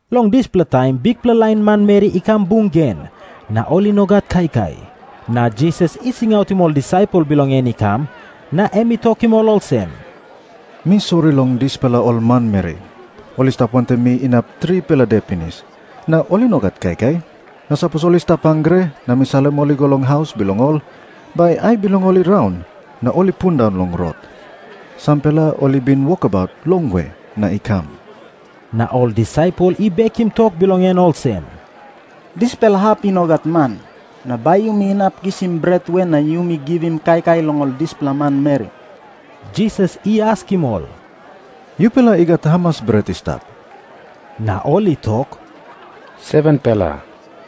Long dispela taim bikpela lain manmeri i kam bung gen, na ol i no gat kaikai. Na Jisas i singautim ol disaipel bilong en i kam, na em i tokim ol olsem, “Mi sori long dispela ol manmeri. Ol i stap wantaim mi inap tripela de pinis, na ol i no gat kaikai. Na sapos ol i stap hangre na mi salim ol i go long haus bilong ol, bai ai bilong ol i raun na ol i pundaun long rot. Sampela ol i bin wokabaut longwe na i kam.” Na ol disaipel i bekim tok bilong en olsem, “Dispela hap i no gat man. Na bai yumi inap kisim bret we na yumi givim kaikai long ol dispela manmeri?” Jisas i askim ol, “Yupela i gat hamas bret i stap?” Na ol i tok, “7-pela.”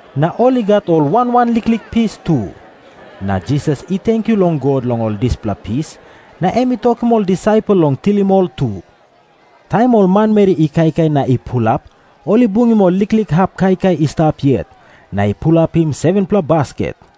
Na ol i gat ol wan wan liklik pis tu. Na Jisas i tenkyu long God long ol dispela pis, na em i tokim ol disaipel long tilim ol tu. Taim ol manmeri i kaikai na i pulap, ol i bungim ol liklik hap kaikai i stap yet, na i pulapim 7-pela basket.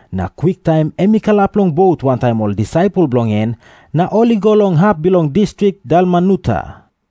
na kwiktaim em i kalap long bot wantaim ol disaipel bilong en, na ol i go long hap bilong distrik Dalmanuta.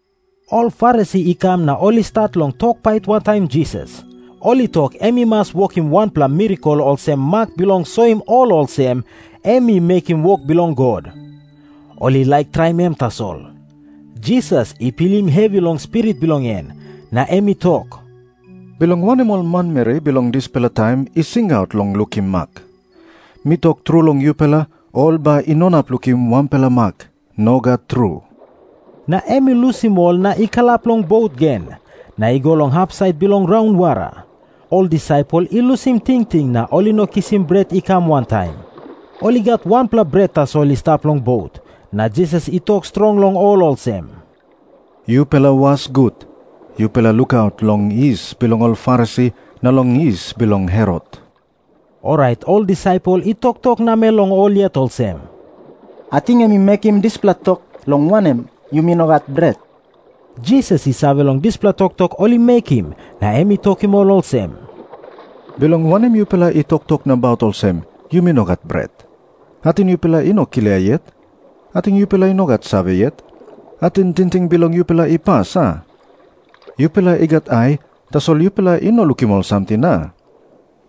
Ol Farisi i kam na ol i stat long tok pait wantaim Jisas. Ol i tok em i mas wokim wanpela mirakel olsem mak bilong soim ol olsem em i mekim wok bilong God. Ol i laik traim em tasol. Jisas i pilim hevi long spirit bilong en, na em i tok, “Bilong wanem ol manmeri bilong dispela taim i singaut long lukim mak? Mi tok tru long yupela, ol bai i no inap lukim wanpela mak. Nogat tru.” Na em i lusim ol na i kalap long bot gen, na i go long hapsait bilong raunwara. Ol disaipel i lusim tingting na ol i no kisim bret i kam wantaim. Ol i gat wanpela bret tasol i stap long bot. Na Jisas i tok strong long ol olsem, “Yupela was gut. Yupela lukaut long yis bilong ol Farisi na long yis bilong Herot.” Orait ol disaipel i toktok namel long ol yet olsem, “Ating em i mekim dispela tok, long wanem, yumi no gat bret.” Jisas i save long dispela toktok ol i mekim, na em i tokim ol olsem, “Bilong wanem yupela i toktok nabaut olsem, ‘Yumi no gat bret’? Ating yupela i no klia yet? Ating yupela i no gat save yet? Ating tingting bilong yupela i pas, a? Yupela i gat ai, tasol yupela i no lukim ol samting, a?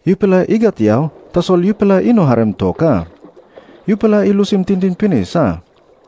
Yupela i gat yau, tasol yupela i no harim tok, a? Yupela i lusim tingting pinis, a?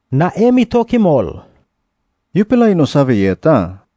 Na em i tokim ol, “Yupela i no save yet, a?”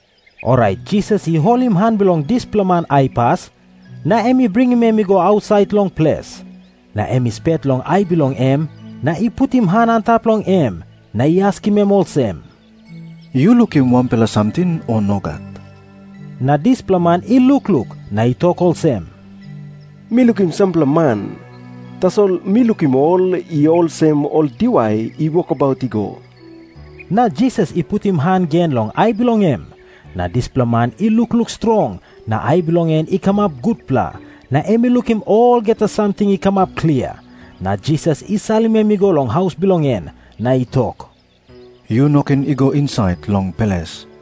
Orait Jisas i holim han bilong dispela man aipas, na em i bringim em i go ausait long ples. Na em i spet long ai bilong em, na i putim han antap long em, na i askim em olsem, “Yu lukim wanpela samting, o nogat?” Na dispela man i lukluk, na i tok olsem, “Mi lukim sampela man. Tasol mi lukim ol i olsem ol diwai i wokabaut i go.” Na Jisas i putim han gen long ai bilong em. Na dispela man i lukluk strong, na ai bilong en i kamap gutpela, na em i lukim olgeta samting i kamap klia. Na Jisas i salim em i go long haus bilong en, na i tok, “Yu no ken i go insait long ples.”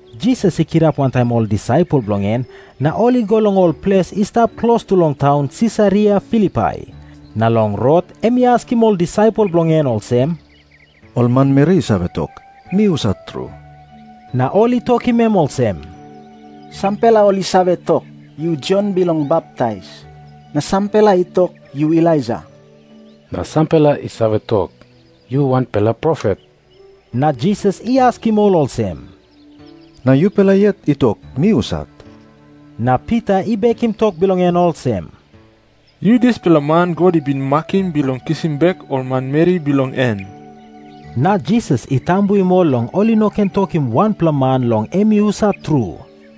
Jisas i kirap wantaim ol disaipel bilong en, na ol i go long ol ples i stap klostu long taun Sisaria Filipai. Na long rot em i askim ol disaipel bilong en olsem, “Ol manmeri i save tok, mi husat tru?” Na ol i tokim em olsem, “Sampela ol i save tok, yu Jon Bilong Baptais. Na sampela i tok, yu Elaija. Na sampela i save tok, yu wanpela profet.” Na Jisas i askim ol olsem, “Na yupela yet i tok mi husat?” Na Pita i bekim tok bilong en olsem, “Yu dispela man God i bin makim bilong kisim bek ol manmeri bilong en.” Na Jisas i tambuim ol long ol i no ken tokim wanpela man long em i husat tru.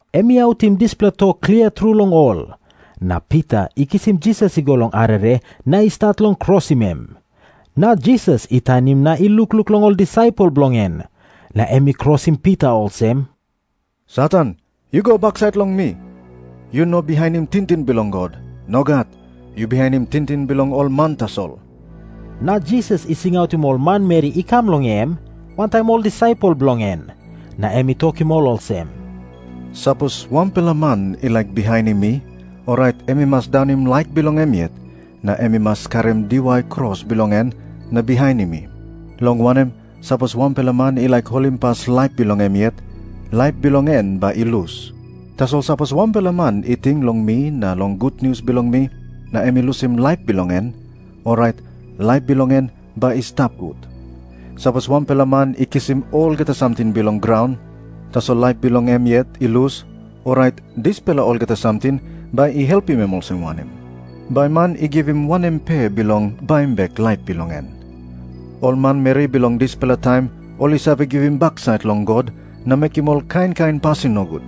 Em i autim dispela tok klia tru long ol. Na Pita i kisim Jisas i go long arere na i stat long krosim em. Na Jisas i tanim na i lukluk long ol disaipel bilong en, na em i krosim Pita olsem, “Satan, yu go baksait long mi. Yu no bihainim tingting bilong God. Nogat. Yu bihainim tingting bilong ol man tasol.” Na Jisas i singautim ol manmeri i kam long em, wantaim ol disaipel bilong en. Na em i tokim ol olsem, “Sapos wanpela man i laik bihainim mi, orait em i mas daunim laik bilong em yet, na em i mas karim diwai kros bilong en na bihainim mi. Long wanem, sapos wanpela man i laik holimpas laip bilong em yet, laip bilong en bai i lus. Tasol sapos wanpela man i ting long mi na long gutnius bilong mi, na em i lusim laip bilong en, orait laip bilong en bai i stap gut. Sapos wanpela man i kisim olgeta samting bilong graun, tasol laip bilong em yet i lus, orait dispela olgeta samting bai i helpim em olsem wanem? Bai man i givim wanem pe bilong baim bek laip bilong en? Ol manmeri bilong dispela taim ol i save givim baksait long God na mekim ol kain kain pasin nogut.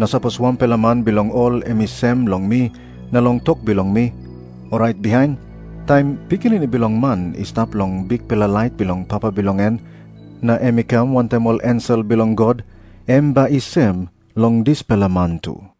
Na sapos wanpela man bilong ol em i sem long mi na long tok bilong mi, orait bihain, taim Pikinini Bilong Man i stap long bikpela lait bilong Papa bilong en na em i kam wantaim ol ensel bilong God, em bai i sem long dispela man tu.”